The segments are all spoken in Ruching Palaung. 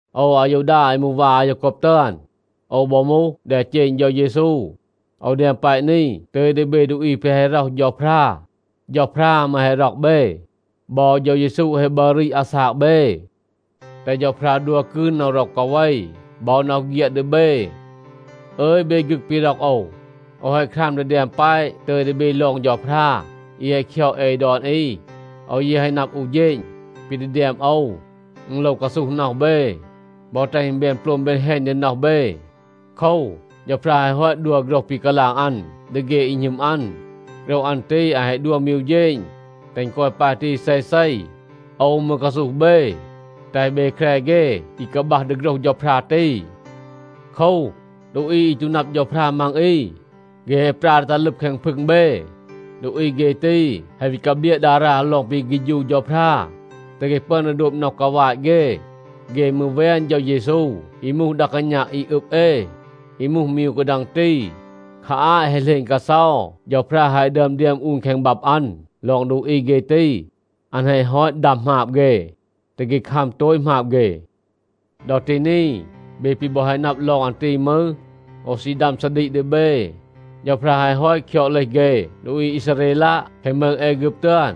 โอว อายูดา อี มูห วา อายาโกบ ตึอน, โอว บอ มูห แดเจณ เฌา เยซู. โอว แดม แปะ นี ตึย ดี เบ ดูอี แปะ แฮะ ร็อห เฌาพรา. เฌาพรา มืร แฮะ ร็อก เบ. บอ เฌา เยซู แฮะ บัร รีด อาซาก เบ. แตห เฌาพรา ดัว กืน น็อห ร็อก กาเว บอ น็อห เฆียด ดี เบ. อึย เบ ฆึก ปี ร็อก โอว, โอว แฮะ คราม ดี แดม แปะ ตึย ดี เบ ลอง เฌาพรา อี แฮะ คยอด เอ ดอน อี. โอว ยี แฮะ นับ อู เฌณ, ปี ดี แดม โอว, อึณ โลว กาซูห น็อห เบ บอ แตห อึณ แบน โปลม แบน แฮณ ดี น็อห เบ. โคว, เฌาพรา แฮะ ฮอต ดัว โฆรห ปี กาลาง อัน ดี เฆ อี หณึม อัน. โฆรห อัน ตี อัน แฮะ ดัว มี อู เฌณ, แตห อึณ กอย ปาย ตี เซเซ. โอว มืร กาซูห เบ, แตห เบ แคร เฆ อี กาบัห ดี โฆรห เฌาพรา ตี. โคว, ดูอี อี ตู นับ เฌาพรา มัง อี, เฆ แฮะ ปรา ดี ตัห ลึบ แคง พึง เบ. ดูอี เฆ ตี แฮะ วี กาเบลียะ ดารา ลอง ปี เฆฌู เฌาพรา, แตห เฆ ปึอน ดี โดบ น็อห กาวาต เฆ. เฆ มืร แวน เฌา เยซู อี มูห ดา กาณา อี อึบ เอ, อี มูห มี อู กาดัง ตี. คา อาต แฮะ เหลณ กาเซา เฌาพรา แฮะ ดึอม แดม อูน แคง บับ อัน ลอง ดูอี เฆ ตี. อัน แฮะ ฮอต ดัม หมาบ เฆ, แตห เฆ คัม โตต หมาบ เฆ. ดอ ตี นี, เบ ปี บอ แฮะ นับ ลอง อัน ตี มืร, โอว ซี ดัม ซาดีก ดี เบ. เฌาพรา แฮะ ฮอต คยอด เลห เฆ ดูอี อีซาเรลัะ แคง มืง แอฆึบ ตึอน.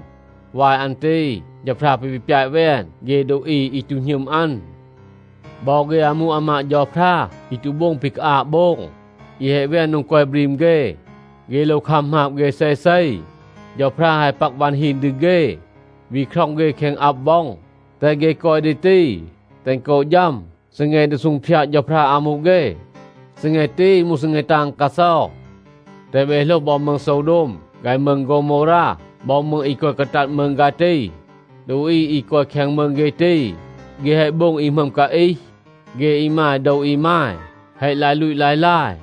วาย อัน ตี เฌาพรา ปี วี ปยาต แวน เฆ ดูอี อี ตู หณึม อัน. บอ เฆ อามู อามาด เฌาพรา อี ตู โบง ปี กาอาบ โบง, อี แฮะ แวน โดง กอย บรีม เฆ, เฆ โลว คัม หมาบ เฆ เซเซ. เฌาพรา แฮะ ปัก วัน ฮีน ดี เฆ, วี คร็อง เฆ แคง อับ ว็อง, แตห เฆ กอย ดี ตี, แตห อึณ กอ ฌัม ซีแง ดี ซูงพยาด เฌาพรา อามู เฆ. ซีแง ตี มูห ซีแง ตาง กาเซา. แตห เบ โหลห บอ มืง โซวโดม ฆาย มืง โฆวโมวรา บอ มืง อี กอย กาตัด มืง ฆาย ตี. ดูอี อี กอย แคง มืง เฆ ตี, เฆ แฮะ โบง อี หมึอม กาอีห. เฆ อีมาย โดว อีมาย แฮะ ลาย ลูต ลาย ลาย,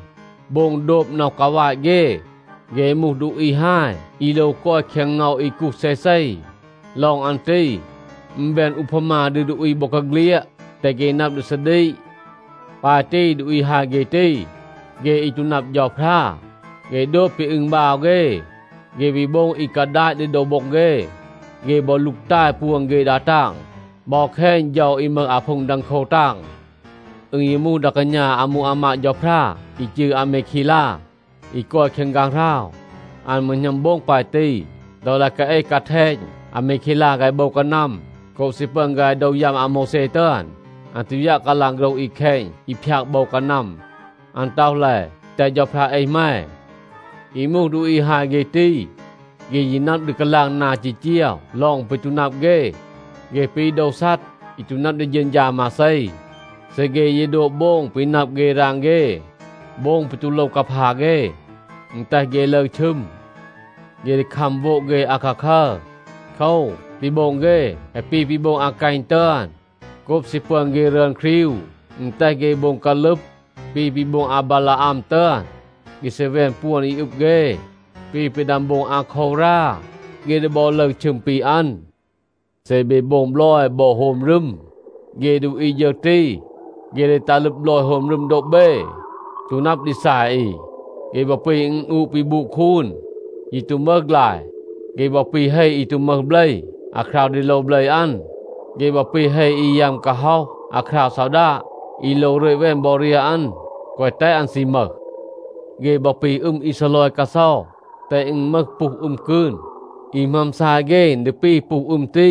โบง โดบ น็อห กาวาต เฆ. เฆ มูห ดูอี ฮาย อี โลว กอย แคง เงา อี กูห เซเซ. ลอง อัน ตี อึณ แบน อูพามา ดี ดูอี บอกาเฆลียด, แตห เฆ นับ ดี ซาดีก. ปาย ตี ดูอี ฮาย เฆ ตี, เฆ อี ตู นับ เฌาพรา, เฆ โดบ ปี อึณบาว เฆ. เฆ วี โบง อี กาดาต ดี โดว โบ็ง เฆ. เฆ บอ ลูกตาย ปวน เฆ ดา ตาง บอ แคณ เฌา อี มึห อาพูง ดังโคว ตาง. อึณ ยี มูห ดา กาณา อามู อามาด เฌาพรา อี จืร อามีเคลา, อี กอย แคง ฆางหราว, อัน มืร หณัม โบง ปาย ตี. ดอ ลาย กาเอห กาแทณ อามีเคลา ฆาย โบว กานัม โกบ ซี ปึอน ฆาย โดว ยัม อาโมวแซ ตึอน, อัน ตู ยัะ กาลาง โฆรห อี แคณ อี พยาก โบว กานัม. อัน ต็อห แล, “แตห เฌาพรา เอห แม.” อี มูห ดูอี ฮาย เฆ ตี, เฆ ยี นับ ดี กาลาง นา จีจีว ลอง ปี ตู นับ เฆ. เฆ ปี โดว ซัด, อี ตู นับ ดี เฌณฌา มาเซ. เซ เฆ ยี โดบ โบง ปี นับ เฆ ราง เฆ, โบง ปี ตู โลว กาพา เฆ, อึณ แตห เฆ ลึร ชึม. เฆ ดี คัม โวด เฆ อาคาคัร. โคว, ปี โบง เฆ แฮะ ปี ปี โบง อากัณ ตึอน. โกบ ซี ปึอน เฆ รึอน ครีว, อึณ แตห เฆ โบง กาลึบ ปี ปี โบง อาบาลาอัม ตึอน. เฆ ซี แวน ปวน อี อึบ เฆ ปี ปี ดึอม โบง อาโควรา. เฆ ดี บอ ลึร ชึม ปี อัน. เซ เบ โบง บลอย บอ โฮม รึม, เฆ ดูอี ฌึร ตี, เฆ ดี ตัห ลึบ บลอย โฮม รึม โดบ เบ, ตู นับ ดี ซาย อี. เฆ บอ ปี อึณอูะ ปี บูด คูน, ยี ตู มึห ฆลาย. เฆ บอ ปี เฮ อี ตู มึห เบล อาคราว ดี โลว เบล อัน. เฆ บอ ปี เฮ อี ยัม กาฮ็อห อาคราว ซอดาด, อี โลว รึต แวน บอ เรียห อัน, แกวะ แตห อึณ ซี มึห. เฆ บอ ปี อึม อี ซีลอย กาเซา, แตห อึณ มึห ปูห อึม กืน. อี หมึอม ซาย เฆ, อึณ ดี ปี ปูห อึม ตี.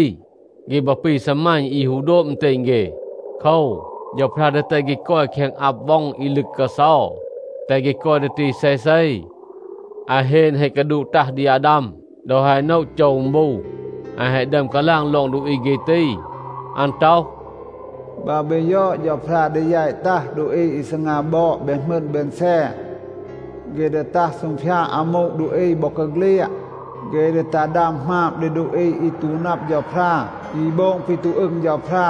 เฆ บอ ปี ซีมัณ อี ฮู โดบ อึณเตณ เฆ. โคว, เฌาพรา ดี แตห เฆ กอย แคง อับ ว็อง อี ลึก กาเซา, แตห เฆ กอย ดี ตี เซเซ. อาเฮน แฮะ กาดูด ตัห ดี อาดาม ดอ แฮะ โนะ โจว อึณ บู. อัน แฮะ ดึอม กาลาง ลอง ดูอี เฆ ตี. อัน ต็อห, “บัร เบ ยอด, เฌาพรา ดี แยต ตัห ดูอี อี ซีงา บอด แบน หมึณ แบน แซน. เฆ ดี ตัห ซูงพยาด อามู ดูอี บอกาเฆลียด. เฆ ดี ตัห ดัม หมาบ ดี ดูอี อี ตู นับ เฌาพรา, อี โบง ปี ตู อึง เฌาพรา.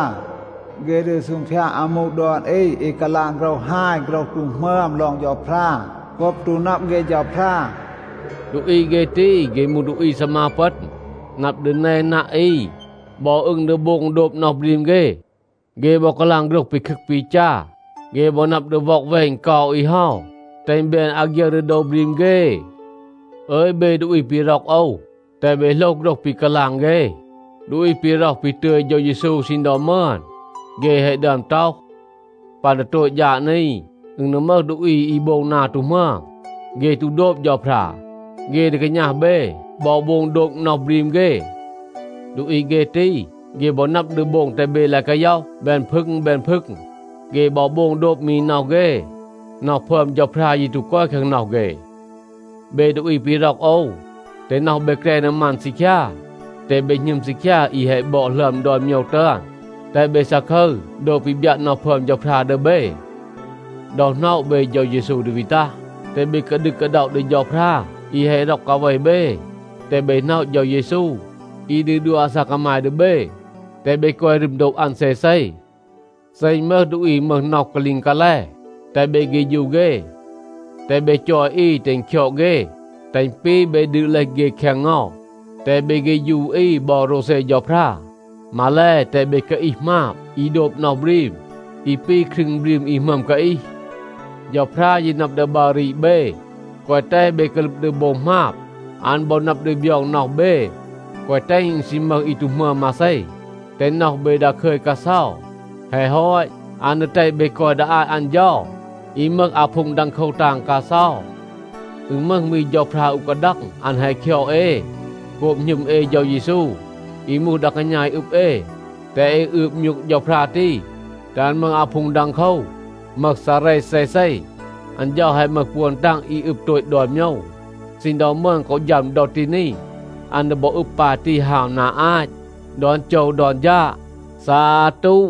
เฆ ดี ซูงพยาด อามู ดอน อี อี กาลาง โฆรห ฮาย โฆรห ตู หมึอม ลอง เฌาพรา โกบ ตู นับ เฆ เฌาพรา.” ดูอี เฆ ตี, เฆ มูห ดูอี ซีมา ปึณ, นับ ดี แนนัะ อี, บอ อึง ดี โบง โดบ น็อห บรีม เฆ. เฆ บอ กาลาง โฆรห ปีคึก ปีจา. เฆ บอ นับ ดี ว็อกแวณ เกา อี เฮา, แตห อึณ แบน อาฆยึร ดี โดว บรีม เฆ. อึย เบ ดูอี ปี ร็อก โอว, แตห เบ โหลห โฆรห ปี กาลาง เฆ ดูอี ปี ร็อห ปี ตึย เฌา เยซู ซีณ ดอ มึอน. เฆ แฮะ ดึอม ต็อห, “ปัน ดี โตต ฌาด นี, อึณ ดี มึห ดูอี อี โบง นา ตู หมึอม. เฆ ตู โดบ เฌาพรา, เฆ ดี กาณัห เบ บอ โบง โดบ น็อห บรีม เฆ.” ดูอี เฆ ตี, เฆ บอ นับ ดี โบง แตห เบ ลาย กาย็อห แบน พึง แบน พึง. เฆ บอ โบง โดบ มี น็อห เฆ. น็อห พึอม เฌาพรา ยี ตู กอย แคง น็อห เฆ. เบ ดูอี ปี ร็อก โอว, แตห น็อห เบ แกร ดี มัน ซีคยา, แตห เบ หณึม ซีคยา อี แฮะ บอด หลึอม ดอน โมยว ตึอน. แตห เบ ซาคึร โดบ ปี บยัะ น็อห พึอม เฌาพรา ดี เบ. ดอ หน็อะ เบ เฌา เยซู ดี วี ตัห, แตห เบ กาดึก กาด็อะ ดี เฌาพรา อี แฮะ ร็อก กาเว เบ. แตห เบ หน็อะ เฌา เยซู, อี ดี ดัว อาซาก กามาย ดี เบ, แตห เบ กอย รึม โดบ อัน เซเซ. เซ อึณ มึห ดูอี อี มึห น็อห กาลีง กาแล, แตห เบ เฆฌู เฆ. แตห เบ จอย อี แตห อึณ คยอด เฆ, แตห อึณ ปี เบ ดืด เลห เฆ แคง เงา. แตห เบ เฆฌู อี บอ โรวเซ เฌาพรา. มาแล, แตห เบ กาอีห หมาบ อี โดบ น็อห บรีม อี ปี ครึง บรีม อี หมึอม กาอีห. เฌาพรา ยี นับ ดี บัร รีด เบ, แกวะ แตห เบ กาลึบ ดี โบง หมาบ. อัน บอ นับ ดี บยอง น็อห เบ, แกวะ แตห อึณ ซี มึห อี ตู หมึอม มาเซ, แตห น็อห เบ ดาคึย กาเซา. แฮะ ฮอต, อัน ดี แตห เบ กอย ดี อาต อัน เฌา อี มึห อาพูง ดังโคว ตาง กาเซา. อึณ มึห มี เฌาพรา อู กาดัง, อัน แฮะ คยอด เอ. โกบ หณึม เอ เฌา เยซู อี มูห ดา กาณา อี อึบ เอ, แตห เอ อืบ มยูก เฌาพรา ตี, แตห อัน มึห อาพูง ดังโคว, มึห ซาเร เซเซ. อัน เฌา แฮะ มึห ปวน ตาง อี อึบ โตต ดอน โมยว ซีณ ดอ มึอน กอ ฌัม ดอ ตี นี. อัน ดี บอ อึบ ปาย ตี ฮาว นา อาต ดอน โจว ดอน ฌาด. ซาตู.